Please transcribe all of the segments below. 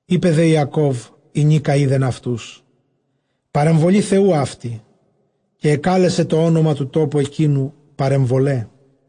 Εἶπε δὲ Ἰακὼβ, ἡνίκα εἶδεν αὐτοὺς, παρεμβολὴ Θεοῦ αὕτη· καὶ ἐκάλεσε τὸ ὄνομα τοῦ τόπου ἐκείνου, Παρεμβολαί.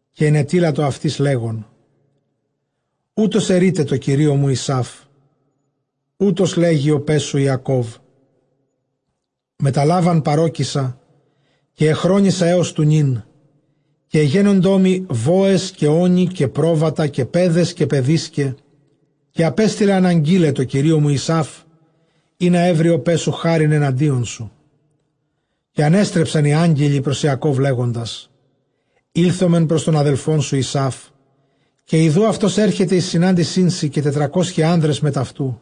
Καὶ ἐνετείλατο αὐτοῖς, λέγων, οὕτως ἐρεῖτε τῷ κυρίῳ μου Ἡσαῦ· οὕτως λέγει ὁ παῖς σου Ἰακώβ· μετὰ Λάβαν παρῴκησα, καὶ ἐχρόνισα ἕως τοῦ νῦν. Καὶ ἐγένοντό μοι βόες, καὶ ὄνοι, καὶ πρόβατα, καὶ παῖδες, καὶ παιδίσκαι· καὶ ἀπέστειλα ἀναγγεῖλαι τῷ κυρίῳ μου Ἡσαῦ, ἵνα εὕρῃ ὁ παῖς σου χάριν ἐναντίον σου. Καὶ ἀνέστρεψαν οἱ ἄγγελοι πρὸς Ἰακὼβ, λέγοντες, ἤλθομεν πρὸς τὸν ἀδελφόν σου Ἡσαυ· καὶ ἰδοὺ αὐτὸς ἔρχεται εἰς συνάντησίν σου, καὶ τετρακόσιοι ἄνδρες μεθʼ αὐτοῦ.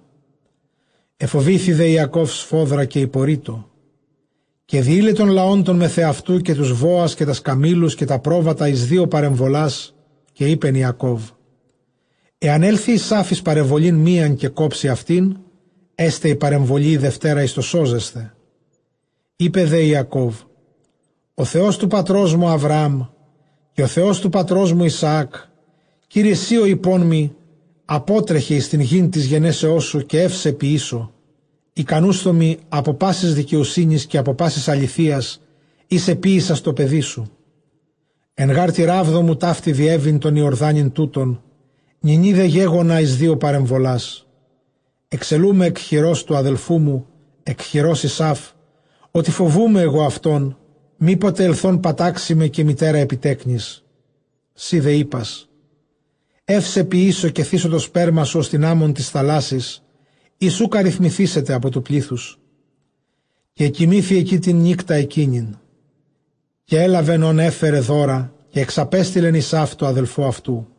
Ἐφοβήθη δὲ Ἰακὼβ σφόδρα, καὶ ἠπορεῖτο· καὶ διεῖλε τὸν λαὸν τὸν μεθʼ ἑαυτοῦ, καὶ τοὺς βόας, καὶ τὰς καμήλους, καὶ τὰ πρόβατα, εἰς δύο παρεμβολάς. Καὶ εἶπεν Ἰακὼβ, ἐὰν ἔλθῃ Ἡσαῦ εἰς παρεμβολὴν μίαν, καὶ κόψῃ αὐτὴν, ἔσται ἡ παρεμβολὴ ἡ δευτέρα εἰς τὸ σώζεσθαι. Εἶπε δὲ Ἰακὼβ, ὁ Θεὸς τοῦ πατρός μου Ἁβραὰμ, καὶ ὁ Θεὸς τοῦ πατρός μου Ἰσαὰκ, Κύριε σὺ ὁ εἰπών μοι, ἀπότρεχε εἰς τὴν γῆν τῆς γενέσεώς σου, καὶ εὖ σε ποιήσω· Ἱκανούσθω μοι ἀπὸ πάσης δικαιοσύνης, καὶ ἀπὸ πάσης ἀληθείας, ἧς ἐποίησας τῷ παιδί σου· ἐν γὰρ τῇ ῥάβδῳ μου ταύτῃ διέβην τὸν Ἰορδάνην τοῦτον· νυνὶ δὲ γέγονα εἰς δύο παρεμβολάς. Ἐξελοῦ με ἐκ χειρὸς τοῦ ἀδελφοῦ μου, ἐκ χειρὸς Ἡσαῦ· ὅτι φοβοῦμαι ἐγὼ αὐτὸν, μή ποτε ἐλθὼν πατάξῃ με, καὶ μητέρα ἐπὶ τέκνοις. Σὺ δὲ εἶπας, εὐ σε ποιήσω, καὶ θήσω τὸ σπέρμα σου ὡς τὴν ἄμμον τῆς θαλάσσης, ἣ οὐκ ἀριθμηθήσεται ὑπὸ τοῦ πλήθους. Καὶ ἐκοιμήθη ἐκεῖ τὴν νύκτα ἐκείνην· καὶ ἔλαβεν ὧν ἔφερεν δῶρα· καὶ ἐξαπέστειλεν Ἡσαῦ τῷ ἀδελφῷ αὐτοῦ,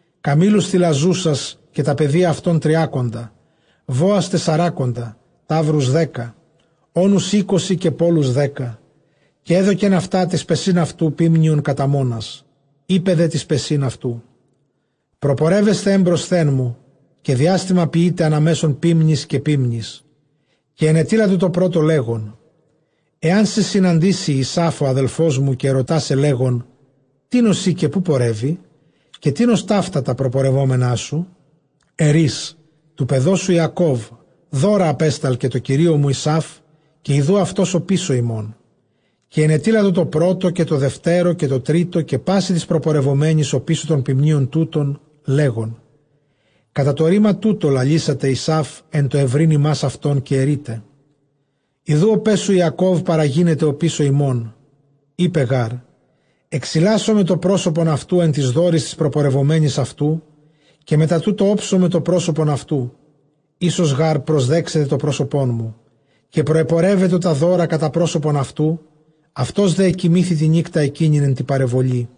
καμήλους θηλαζούσας καὶ τὰ παιδία αὐτῶν τριάκοντα, βόας τεσσαράκοντα, ταύρους δέκα, ὄνους εἴκοσι, καὶ πώλους δέκα. Καὶ ἔδωκεν αὐτὰ τοῖς παισὶν αὐτοῦ ποίμνιον κατὰ μόνας· εἶπε δὲ τοῖς παισὶν αὐτοῦ, προπορεύεσθε ἔμπροσθέν μου, καὶ διάστημα ποιεῖτε ἀνὰ μέσον ποίμνης καὶ ποίμνης. Καὶ ἐνετείλατο τῷ πρώτῳ, λέγων, ἐάν σοι συναντήσῃ Ἡσαῦ ὁ ἀδελφός μου, καὶ ἐρωτᾷ σε, λέγων, τίνος εἶ; καὶ ποῦ πορεύῃ; καὶ τίνος ταῦτα τὰ προπορευόμενά σου; Ἐρεῖς, τοῦ παιδός σου Ἰακώβ· δῶρα ἀπέσταλκε τῷ κυρίῳ μου Ἡσαῦ· καὶ ἰδοὺ αὐτὸς ὀπίσω ἡμῶν. Καὶ ἐνετείλατο τῷ πρώτῳ, καὶ τῷ δευτέρῳ, καὶ τῷ τρίτῳ, καὶ πᾶσι τοῖς προπορευομένοις ὀπίσω τῶν ποιμνίων τούτων, λέγων, κατὰ τὸ ῥῆμα τοῦτο λαλήσατε Ἡσαῦ ἐν τῷ εὑρεῖν ὑμᾶς αὐτόν· Καὶ ἐρεῖτε, ἰδοὺ ὁ παῖς σου Ἰακὼβ παραγίνεται ὀπίσω ἡμῶν· εἶπε γὰρ, ἐξιλάσομαι τὸ πρόσωπον αὐτοῦ ἐν τοῖς δώροις τοῖς προπορευομένοις αὐτοῦ, καὶ μετὰ τοῦτο ὄψομαι τὸ πρόσωπον αὐτοῦ· ἴσως γὰρ προσδέξεται τὸ πρόσωπόν μου. Καὶ προεπορεύετο τὰ δῶρα κατὰ πρόσωπον αὐτοῦ· αὐτὸς δὲ ἐκοιμήθη τὴν νύκτα ἐκείνην ἐν τῇ παρεμβολῇ.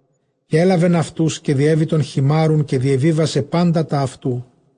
Καὶ ἔλαβεν αὐτοὺς, καὶ διέβη τὸν χειμάῤῥουν, καὶ διεβίβασε πάντα τὰ αὐτοῦ.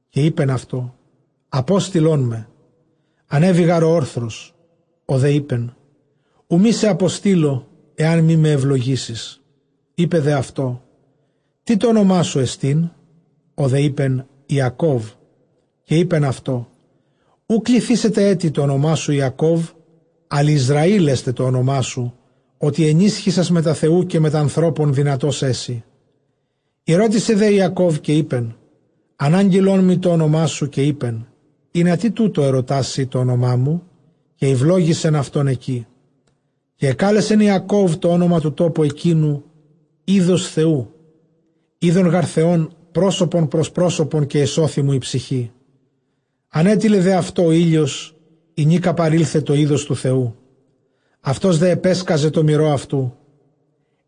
Καὶ εἶπεν αὐτῷ, ἀπόστειλόν με, ἀνέβη γὰρ ὁ ὄρθρος. ὁ δὲ εἶπεν, οὐ μή σε ἀποστείλω, ἐὰν μή με εὐλογήσῃς. Εἶπε δὲ αὐτῷ, τί τὸ ὄνομά σου ἐστίν; ὁ δὲ εἶπεν, Ἰακώβ. Καὶ εἶπεν αὐτῷ, οὐ κληθήσεται ἔτι τὸ ὄνομά σου Ἰακὼβ, ἀλλʼ Ἰσραὴλ ἔσται τὸ ὄνομά σου· ὅτι ἐνίσχυσας μετὰ Θεοῦ, καὶ μετὰ ἀνθρώπων δυνατὸς ἔσῃ. Ἠρώτησε δὲ Ἰακὼβ, καὶ εἶπεν, ἀνάγγειλόν μοι τὸ ὄνομά σου· καὶ εἶπεν, ἱνατί τοῦτο ἐρωτᾷς σὺ τὸ ὄνομά μου; καὶ εὐλόγησεν αὐτὸν ἐκεῖ. Καὶ ἐκάλεσεν Ἰακὼβ τὸ ὄνομα τοῦ τόπου ἐκείνου, εἶδος Θεοῦ· εἶδον γὰρ Θεὸν πρόσωπον πρὸς πρὸσωπον, καὶ ἐσώθη μου ἡ ψυχή. Ἀνέτειλεν δὲ αὐτῷ ὁ ἥλιος, ἡνίκα παρῆλθε τὸ εἶδος τοῦ Θεοῦ· αὐτὸς δὲ ἐπέσκαζε τῷ μηρῷ αὐτοῦ.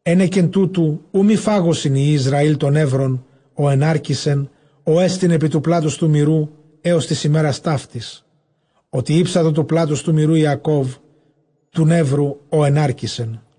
Ἕνεκεν τούτου οὐ μὴ φάγωσιν υἱοὶ Ἰσραὴλ τὸ νεῦρον, ὃ ἐνάρκησεν, ὅ ἐστιν ἐπὶ τοῦ πλάτους τοῦ μηροῦ, ἕως τῆς ἡμέρας ταύτης, ὅτι ἥψατο τοῦ πλάτους τοῦ μηροῦ Ἰακὼβ τοῦ νεύρου, ὃ ἐνάρκησεν.